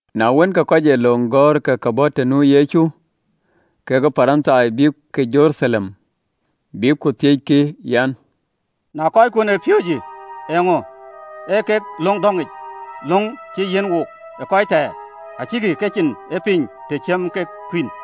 Na wën, ke Parithai kekë kɔc ee löŋ gɔ̈ɔ̈r ë ke bɔ̈ të nu Yecu ë Jeruthalem, bïkkï ku thiëckï, an, “Eeŋö ye kɔckuön ë piööcë löŋ dhɔ̈ŋic, löŋ cï yiɛ̈n wook ë röördït? Acïkï kecin ee piny, të ciɛm kek kuïn!”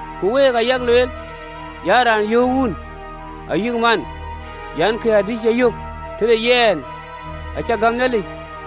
Ku week ayak lueel an, ‘Raan yöök wun ayï man an, kën adï cï yök tëde yɛn, acä gäm Nhialic,’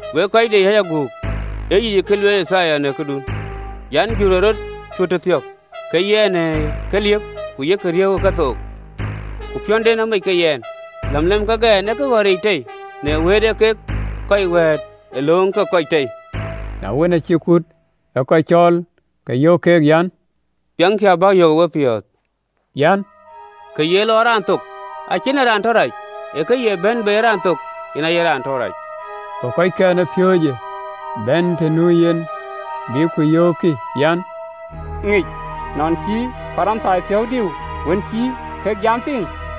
Wek kɔc de yäc aguk, ee yic ee kë lueel Yithaya në këdun an, (LXX). “Jurë ee rɔt cuöt tëthiɔ̈k ke yɛn në keliëp, ku yek a riëëu ë kethook, Ku piɔ̈nden amec kek yɛn. Läm lɛm kek ɛn ee këɣɔ̈ric tei, Na wëët ee kek kɔc wɛ̈ɛ̈t ë lööŋ ke kɔc tei. Na wën, acï kut ë kɔc cɔɔl, ke yöök keek, an, “Piɛŋkï, a bäk yök ë wepiɔ̈ɔ̈th, an, kë ye lɔ ë raan thok acie yen ee raan tɔ rac, ee kë ye bɛ̈n bei ë raan thok, yen aye raan tɔ rac.” Go kɔckɛn ë piööcë bɛ̈n të nu yen, bïk ku yöökkï an, “Ŋic nɔn cï Parithai piɔ̈ɔ̈th diu, wën cï kek jamë piŋ?”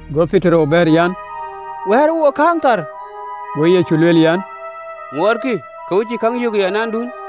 Go Petero bɛ̈ɛ̈r an, “Wɛ̈ɛ̈rë wook kääŋë thar.” Go Yecu lueel an, “Ŋuɔɔtkï ke we cïï käŋ ŋic ayadäŋ?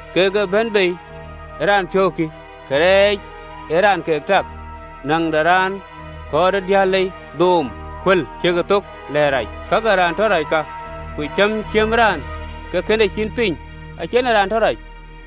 Kak ee bɛ̈n bei ë raan piɔ̈u kï, karɛc ee raan ke tak, näŋ de raan, kɔ̈ɔ̈r ë diëër lei, dhööm, kuël, ciëkë thok, lɛ̈ɛ̈t rac. Kak ee raan tɔ rac ka, ku cäm ciëmë raan ke kën e cin piny, acïï yen ee tɔ rac.”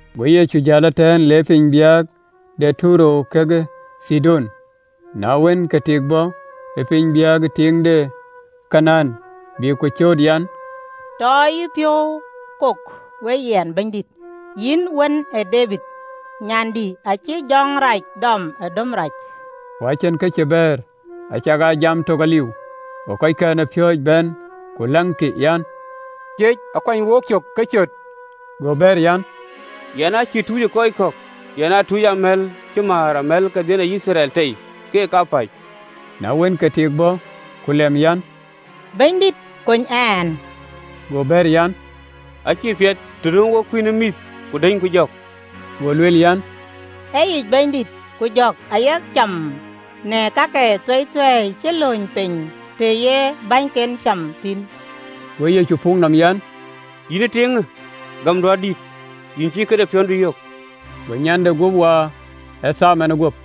Go Yecu jäl ëtɛ̈ɛ̈n, le piny biäk de Tayer kekë Thidon. Na wën, ke tik bɔ̈ ë piny biäkë, tiiŋ de Kanaan, bï ku cööt an, “Tɔ yïpiɔ̈u kok we yɛn, Bɛ̈nydït, Yïn Wën ë Debid, nyandï acïï jɔŋ rac dɔmë döm rac.” Ku acïn kë cï bɛ̈ɛ̈r, acakaa jam tök aliu. Go kɔckɛn ë piööcë bɛ̈n ku läŋkï an, “Ciec, akuany wocök ke cöt!” Go bɛ̈ɛ̈r an, “Yɛn aa cïï tucë kɔc kɔ̈k, yɛn a tucë amɛ̈l cï määr amɛ̈l ke baai de Yithriɛl tei, keek kapäc.” Na wën, ke tik bɔ̈ ku lɛm an, “Bɛ̈nydït, kony ɛn.” Go bɛ̈ɛ̈r an, “Acïï piɛth të nööm wok kuïn ë mïth, ku dënyku jɔ̈k.” Go lueel an, “Ee yic, Bɛ̈nydït, ku jɔ̈k ayek cam në kak athueithuei cï lööny piny të ye bänyken cam thïn.” Go Yecu puk nɔm an, “Yïn ë tiiŋë, gämdu adït, yïn cï këde piɔ̈ndu yök.” Go nyande guöp waar ë thaar manë guöp.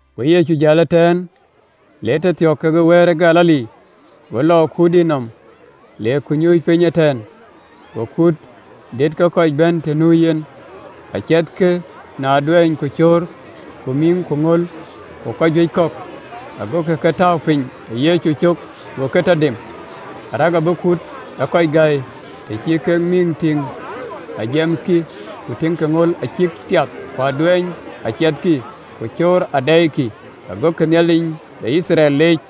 Go Yecu jäl ëtɛ̈ɛ̈n, le tëthiɔ̈k ke Baar ë Galili, go lɔ ë kuurdït nɔm, le ku le nyuc piny ëtɛ̈ɛ̈n. Go kuut dït ke kɔc bɛ̈n të nu yɛn, aciɛthkï në aduɛɛny, ku cöör, ku mïŋ, ku ŋöl, ku kɔc juëc kɔ̈k, agokï ke tääu piny ë Yecu cök, go ke tɔ dem, arëk abï kut ë kɔc gäi, të cï kek mïŋ tïŋ ajamkï, ku tïŋkï ŋöl acïk piath, ku aduɛɛny aciɛthkï, ku cöör adɛɛikï gokï Nhialic de Yithriɛl leec.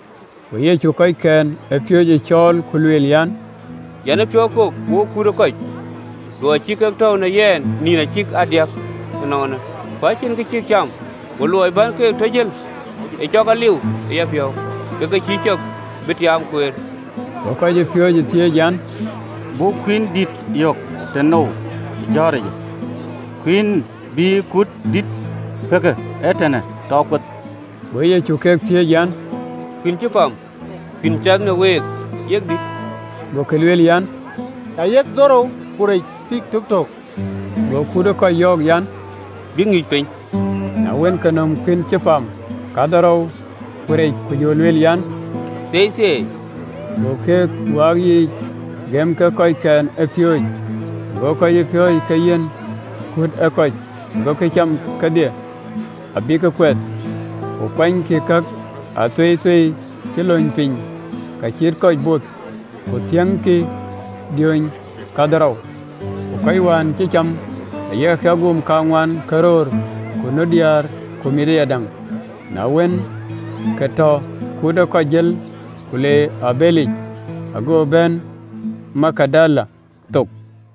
Go Yecu kɔckɛn ë piööcë cɔɔl, ku lueel an, “Yɛn ë piɔ̈u kok wokë kut ë kɔc, ë luɔi cï kek tɔ̈u në yɛn ënɔɔnë ë nïn kadiäk, ku acïn kë cïk cam, ku luɔi bän keek tɔ jël ë cɔk aliu ë yapiɔ̈u, ke ke cïï cɔk bï tiaam kueer.” Go kɔcpiööcë thiëëc an, “Buk kuïn dït yök tënou ë jɔ̈ɔ̈ric, kuïn bï kut dïït pëk ëtɛ̈ɛ̈n tɔ kueth?” Go Yecu ke thiëëc an, “Ee kuïïn cï pam kadï kek cath në week?” Gokï bɛ̈ɛ̈r an, “Ayek dhorou, ku rec thii töktöök.” Go Yecu kut ë kɔc yɔ̈ɔ̈k bïk nyuc piny. Na wën, ke nöm kuïïn cï pam kadhorou, ku rec, ku jɔ lëk Nhialic thieithieei, ku wɛ̈ɛ̈k ke yiic, ku gëm keek kɔckɛn ë piööcë, go kɔcpiööcë ke yiɛ̈n kut ë kɔc. Gokï cam kedhie abïk kuɛth, ku kuanykï kak athueithuei cï lööny piny ka cïï kɔc both, ku thiäŋkï diööny kadhorou. Ku kɔc wën cï cam ayek agum kaŋuan ke röör, ku nu diäär ku mïth ayadäŋ. Na wën, ke tɔ kut ë kɔc jël, ku le e abëlic, ago bɛ̈n piny ë Magadan thok.